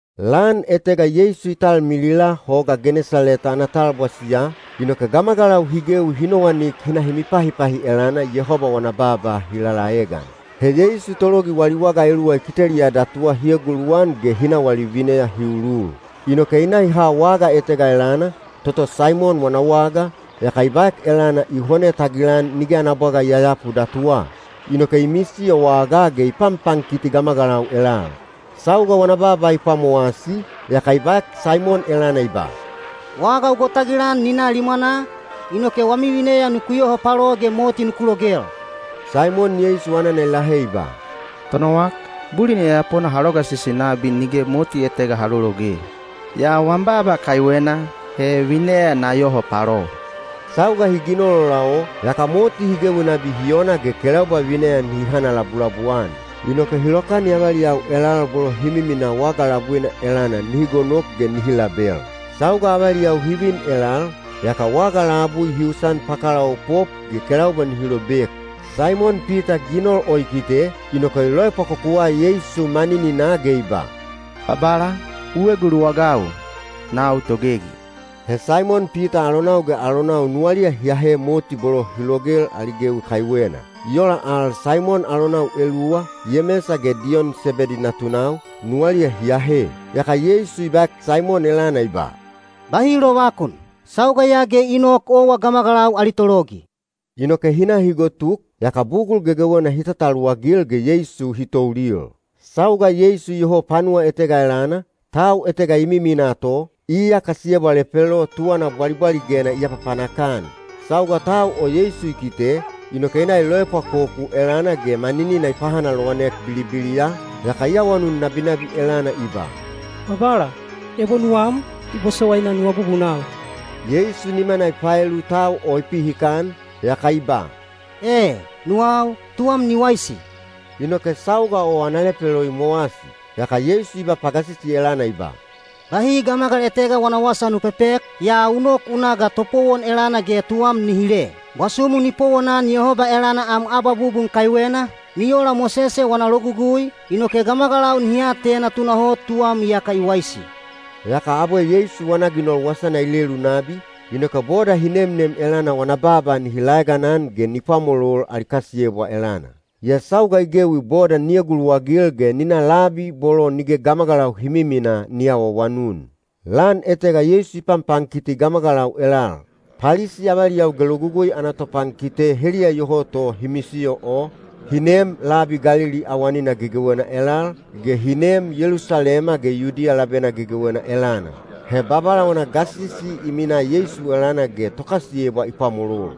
Lan etega Yeisu i talmilila Hoga Genesaleta ana talbwasiya, inoke gamagalau hi gewi hi nowanik hi na hi mipahipahi elana Yehoba wana baaba hi lalaegan. He Yeisu tologi wali waga eluwa i kiteliya datuwa hi eguluwan ge hi na wali vineya hi ulul. Inoke i na i ha waga etega elana, toto Saimon wana waga, yaka i baek elana i hone tagilan nige ana bwaga i yayapu datuwa. Inoke i misiyo wagaa ge i panpankiti gamagalau elal. Sauga wana baaba i pwamowasi, yaka i baek Saimon elana i ba, “Waga u gotagilan ni na limwana, inoke wami vineya nuku yoho palo ge moti nuku logel.” Saimon Yeisu anana i lahe i ba, “Tonowak, bulin yayapona ha logasisi nabi nige moti etega ha lologe. Yaa wam baaba kaiwena, he vineya na yoho palo.” Sauga hi ginol ola o, yaka moti hi gewi nabi hi ona ge kelaubwa vineya nihi hanalabulabu-an. Inoke hi lokani avaliyau elal bolo hi miminaa waga labuina elana nihi gonok ge nihi label. Sauga avaliyau hi vin elal, yaka waga labui hi usan pakalaopop ge kelaubwa nihi lobek. Saimon Pita ginol o i kite, inoke i loepwakokuwa Yeisu manininaa ge i ba, “Babala, u eguluwagau, nau togegi.” He Saimon Pita alonau ge alonau nuwaliya hi ahe moti bolo hi logel ali gewi kaiwena. I ola al Saimon alonau eluwa, Yemesa ge Diyon Sebedi natunau, nuwaliya hi ahe. Yaka Yeisu i baek Saimon elana i ba, “Bahi lovakun. Sauga ya ge i nok owa gamagalau ali tologi.” Inoke hi na hi gotuk, yaka bugul gegewena hi tataluwagil ge Yeisu hi toulil. Sauga Yeisu iyoho panuwa etega elana, tau etega i miminaa to, iya kasiyebwa lepelo tuwana bwalibwaligena i apapanak-an. Sauga tau o Yeisu i kite, inoke i na i loepwakoku elana ge maninina i pahanalowanek bilibiliya, yaka i awanun nabinabi elana i ba, “Babala, ebo nuwam, i bosowaina nu abubunau.” Yeisu nimana i paelu tau o i pihikan, yaka i ba, “E, nuwau. Tuwam ni waisi!” Inoke sauga o ana lepelo i mowasi. Yaka Yeisu i ba pagasisi elana i ba, “Bahi gamagal etega wana wasa nu pepek, yaa u nok u na ga topowon elana ge tuwam ni hile. Bwasumu ni powonan Yehoba elana am abwabubun kaiwena, ni ola Mosese wana Logugui, inoke gamagalau nihi atena tunahot tuwam iyaka i waisi.” Yaka abwe Yeisu wana ginol wasana i lelu nabi, inoke boda hi nemnem elana wana baaba nihi laeganan ge ni pwamolol ali kasiyebwa elana. Yaa sauga i gewi boda ni eguluwagil ge ni na labi bolo nige gamagalau hi miminaa ni awaawanun. Lan etega Yeisu i panpankiti gamagalau elal. Palisi avaliyau ge Logugui ana topankite heliya iyoho to hi misiyo o, hi neem labi Galili awanina gegewena elal, ge hi neem Yelusalema ge Yudiya labena gegewena elana. He Babala wana gasisi i minaa Yeisu elana ge tokasiyebwa i pwamolol.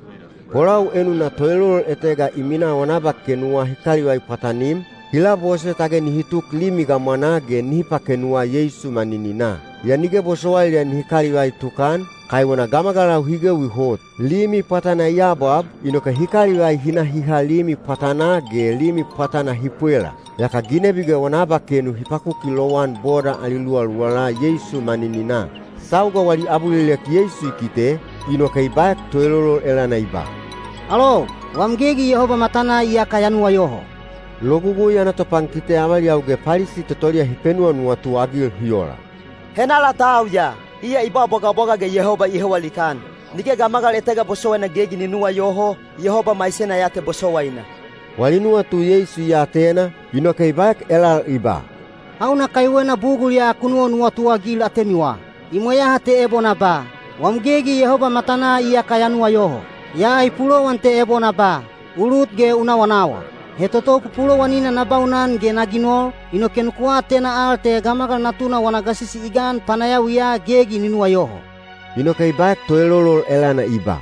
Bolau enuna toelolol etega i minaa wana abakenuwa hi kalivai pwatanim, hi labose tage nihi tuk limi gamwanaa ge nihi pakenuwa Yeisu manininaa. Yaa nige bosowailiya nihi kalivai tukan, kaiwena gamagalau hi gewi hot. Limi pwatana i abwab, inoke hi kalivai hi na hi ha limi pwatanaa ge limi pwatana hi pwela. Yaka ginebi ge wana abakenu hi pakuki lowan boda ali luwaluwala Yeisu manininaa. Sauga wali abulilek Yeisu i kite, inoke i baek toelolol elana i ba, “Alou, wam gegi Yehoba matanaa iyaka ya nuwayoho.” Logugui ana topankite avaliyau ge Palisi totoliya hi penuwanuwatu-agil hi ola, “Henala tau ya? Iya i ba bwagabwaga ge Yehoba i hewa likaan! Nige gamagal etega bosowaina gegi ni nuwayoho, Yehoba maisena ya te bosowaina.” Wali nuwatu Yeisu i atena, inoke i baek elal i ba, “Hauna kaiwena bugul ya ku nuwanuwatu-agil atemiwa? I mweyaha te ebo na ba, ‘Wam gegi Yehoba matanaa iyaka ya nuwayoho.’ Yaa i pulowan te ebo na ba, ‘U lut ge u nawanawa.’ He toto pupulowanina na baunan ge na ginol, inoke nuku atena al te Gamagal Natuna wana gasisi i gan panayawiya gegi ni nuwayoho.” Inoke i baek toelolol elana i ba,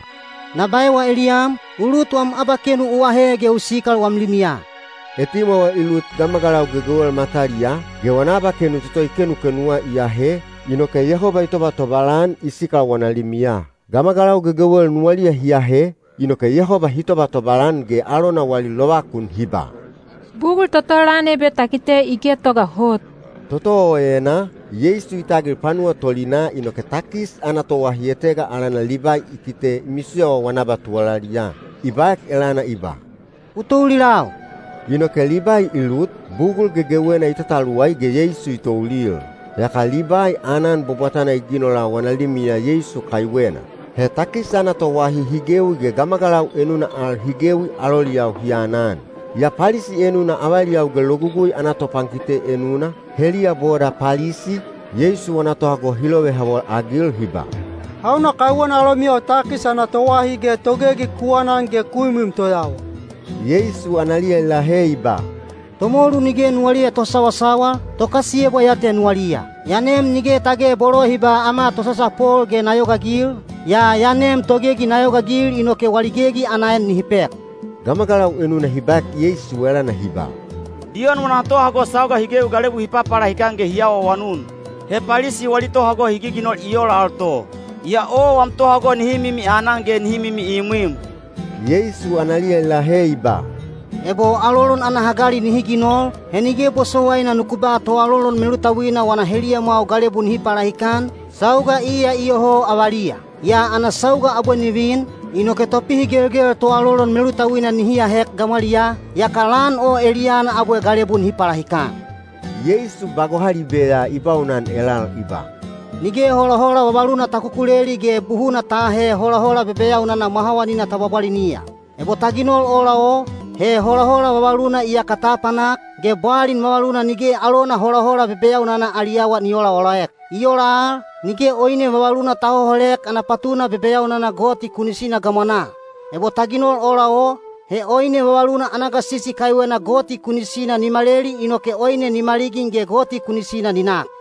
“Na baewa eliyam, u lut wam abakenu u ahe ge u sikal wam limiya.” Etimwawa i lut gamagalau gegewel mataliyaa, ge wana abakenu toto i kenukenuwa i ahe, inoke Yehoba i tobatobal-an i sikal wana limiya. Gamagalau gegewel nuwaliya hi ahe, inoke Yehoba hi tobatobal-an ge alona wali lovakun hi ba, “Bugul toto lan ebe ta kite i getoga hot.” Toto o enaa, Yeisu i tagil panuwa tolinaa inoke takis ana toahi etega alana Libai i kite i misiyowa wana abatuwalaliya. I baek elana i ba, “U toulilau.” Inoke Libai i lut, bugul gegewena i tataluwai ge Yeisu i toulil. Yaka Libai aanan bwabwatana i ginola wana limiya Yeisu kaiwena. He takis ana toahi hi gewi ge gamagalau enuna al hi gewi aloliyau hi anan. Yaa Palisi enuna avaliyau ge logugui ana topankite enuna, heliya boda Palisi, Yeisu wana tohago hi lovehawol-agil hi ba, “Hauna kaiwena alomiyau takis ana toahi ge togegi ku anan ge ku imwim toyawa?” Yeisu analiya i lahe i ba, “Tomolu nige nuwaliya tosawasawal, tokasiyebwa ya te nuwaliya. Ya nem nige tage bolo hi ba ‘Ama tosasapol’ ge na yogaagil, yaa ya nem togegi na yogaagil inoke wali gegi ana en nihi pek.” Gamagalau enuna hi baek Yeisu elana hi ba, “Diyon wana tohago sauga hi gewi galebu hi papalahikan ge hi awaawanun. He Palisi wali tohago hi giginol i ola al to. Yaa owa wam tohago nihi mimi anan ge nihi mimi imwim.” Yeisu analiya i lahe i ba, “Ebo alolon ana hagali nihi ginol, he nige bosowaina nuku ba toalolon melutauina wana heliyamwau galebu nihi palahikan, sauga iya iyoho avaliya. Yaa ana sauga abwe ni vin, inoke topihigelgel toalolon melutauina nihi ahek gamwaliyaa, yaka lan o eliyana abwe galebu nihi palahikan.” Yeisu ba gohalibe ya i baunan elal i ba, “Nige holahola vavaluna ta kukuleli ge buhuna ta aahe holahola bebeyaunana mwahawanina ta bwabwaliniya. Ebo ta ginol ola o, he holahola vavaluna iyaka ta apanak, ge bwalin vavaluna nige alona holahola bebeyaunana ali awa ni oolaolaek. I ola al, nige oine vavaluna ta hoholek ana patuna bebeyaunana gamwanaa toto goti kunisina hi ginoliya. Ebo ta ginol ola o, he oine vavaluna ana gasisi kaiwena goti kunisina ni maleli inoke oine ni maligin ge goti kunisina ni nak.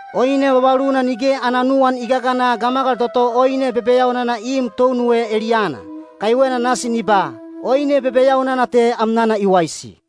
“Oine vavaluna nige ana nuwan i gagana gamagal toto oine bebeyaunana i im tounuwe eliyana. Kaiwena nasi ni ba, ‘Oine bebeyaunana te amnana i waisi.’”